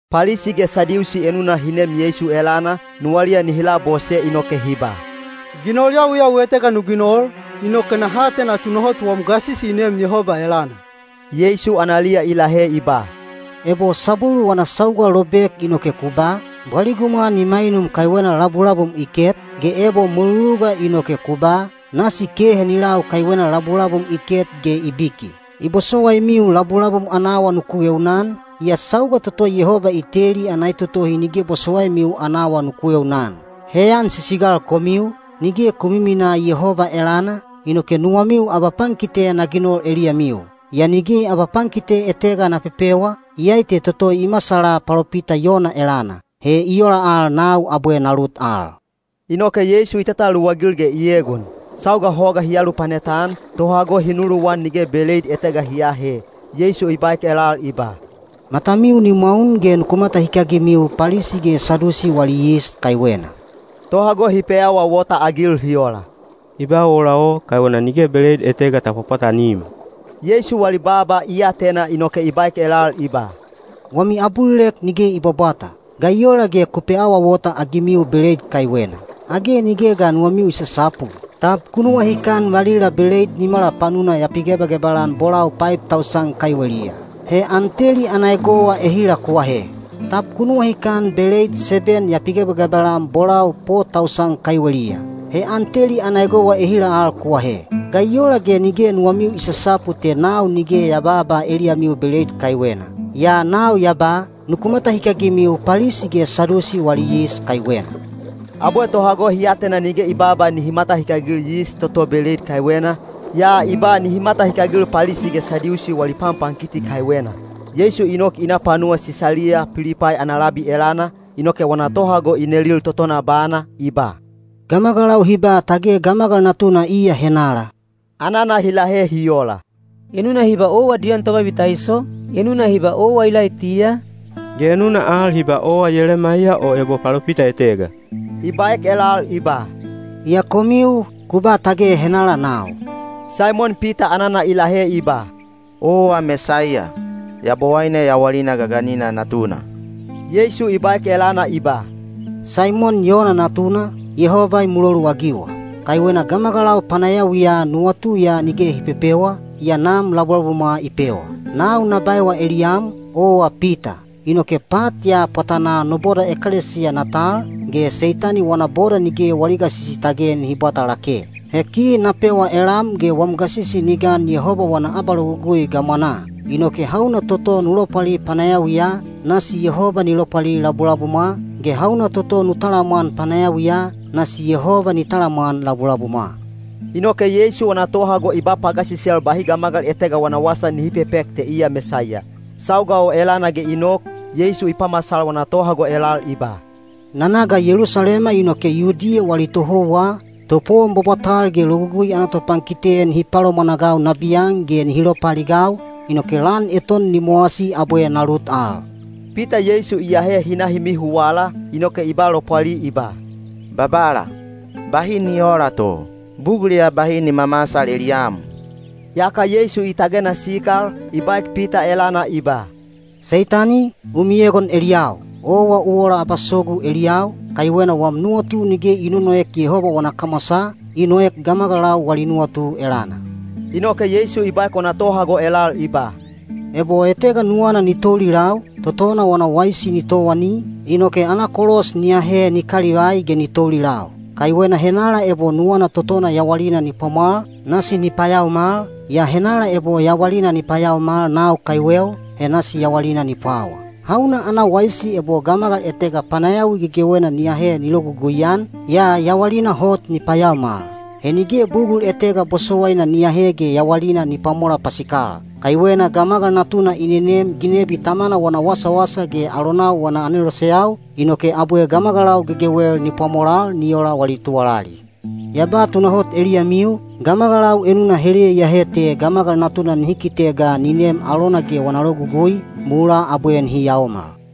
Palisi ge Sadiusi enuna hi nem Yeisu elana, nuwaliya nihi labose inoke hi ba, “Ginol yawiyawi etega nu ginol, inoke naha atena tunahot wam gasisi i neem Yehoba elana.” Yeisu analiya i lahe i ba, “Ebo sabwelu wana sauga lobek inoke ku ba, ‘Bwaligumwa ni mainum kaiwena labulabum i ket,’ ge ebo mweluluga inoke ku ba, ‘Nasi kehe ni lau kaiwena labulabum i ket ge i biki.’ I bosowaimiu labulabum ana awa nuku eunaan, yaa sauga toto Yehoba i teli ana etotohi nige bosowaimiu ana awa nuku eunaan. Heyan sisigal komiu, nige ku miminaa Yehoba elana, inoke nuwamiu abapankite na ginol eliyamiu. Yaa nige abapankite etega na pepewa, iyai te toto i masala palopita Yona elana. He i ola al nau abwe na lut al.” Inoke Yeisu i tataluwagil ge i egon. Sauga hoga hi alupanet-an, tohago hi nuluwan nige beleid etega hi aahe. Yeisu i baek elal i ba, “Matamiu ni mwaun ge nuku matahikagimiu Palisi ge Sadiusi wali yis kaiwena.” Tohago hi peawaawota-agil hi ola, “I ba ola o kaiwena nige beleid etega ta pwapwatanim.” Yeisu wali baaba i atena inoke i baek elal i ba, “Wami abulilek nige i bwabwata! Ga i ola ge ku peawaawota-agimiu beleid kaiwena. Age nige ga nuwamiu i sasapu? Tab ku nuwahikan valila beleid nimala panuna ya pigebagebal-an bolau paib tausan kaiweliya? He an teli ana egowa ehila ku ahe? Tab ku nuwahikan beleid seben ya pigebagebal-an bolau po tausan kaiweliya? He an teli ana egowa ehila al ku ahe? Ga i ola ge nige nuwamiu i sasapu te nau nige ya baaba eliyamiu beleid kaiwena? Yaa nau ya ba, ‘Nuku matahikagimiu Palisi ge Sadiusi wali yis kaiwena.’” Abwe tohago hi atena nige i baaba nihi matahikagil yis toto beleid kaiwena, yaa i ba nihi matahikagil Palisi ge Sadiusi wali panpankiti kaiwena. Yeisu i nok i na panuwa Sisaliya Pilipai ana labi elana, inoke wana tohago i nelil totona bana, i ba, “Gamagalau hi ba tage Gamagal Natuna iya henala?” Anana hi lahe hi ola, “Enuna hi ba owa Diyon Tobabitaiso, enuna hi ba owa Ilaitiya, ge enuna al hi ba owa Yelemaiya o ebo palopita etega.” I baek elal i ba, “Yaa komiu, ku ba tage henala nau?” Saimon Pita anana i lahe i ba, “Owa Mesaiya, Yabowaine yawalina gaganina Natuna.” Yeisu i baek elana i ba, “Saimon Yona natuna, Yehoba i muloluagiwa! Kaiwena gamagalau panayawiya nuwatu ya nige hi pepewa, yaa Nam labulabumwa i pewa. Nau na baewa eliyam, owa Pita, inoke pat ya pwatanaa no boda ekelesiya na tal, ge Seitani wana boda nige wali gasisi tage nihi bwata lake. He ki na pewa elam ge wam gasisi ni gan Yehoba wana abalogugui gamwanaa; inoke hauna toto nu lopwali panayawiya, nasi Yehoba ni lopwali labulabumwa, ge hauna toto nu talamwan panayawiya, nasi Yehoba ni talamwan labulabumwa.” Inoke Yeisu wana tohago i ba pagasisel bahi gamagal etega wana wasa nihi pepek te iya Mesaiya. Sauga o elana ge i nok, Yeisu i pamasal wana tohago elal i ba, “Na na ga Yelusalema inoke Yudiya wali tohouwa, topowon bwabwatal ge Logugui ana topankite nihi palomwanagau nabiyan ge nihi lopaaligau, inoke lan eton ni mowasi abwe na lut al.” Pita Yeisu i ahe hi na hi mihuwala, inoke i ba lopwali i ba, “Babala, bahi ni oola to! Bugul ya bahi ni mamasal eliyam.” Yaka Yeisu i tagena sikal, i baek Pita elana i ba, “Seitani, u miegon eliyau! Owa u ola abasogu eliyau, kaiwena wam nuwatu nige i nonoek Yehoba wana kamwasaa, i noek gamagalau wali nuwatu elana.” Inoke Yeisu i baek wana tohago elal i ba, “Ebo etega nuwana ni toulilau, totona wana waisi ni towani, inoke ana kolos ni ahe ni kalivai ge ni toulilau. Kaiwena henala ebo nuwana totona yawalina ni pwamwal, nasi ni payaomal, yaa henala ebo yawalina ni payaomal nau kaiweu, he nasi yawalina ni pwawa. Hauna ana waisi ebo gamagal etega panayawi gegewena ni ahe ni logugui-an, yaa yawalina hot ni payaomal. He nige bugul etega bosowaina ni ahe ge yawalina ni pwamola pasikal. Kaiwena Gamagal Natuna i nenem ginebi Tamana wana wasawasa ge alonau wana aneloseyau, inoke abwe gamagalau gegewel ni pwamolal ni ola wali tuwalali. Ya ba tunahot eliyamiu, gamagalau enuna heliya iyahe te Gamagal Natuna nihi kite ga ni nem alona ge wana logugui, mulaa abwe nihi yaomal.”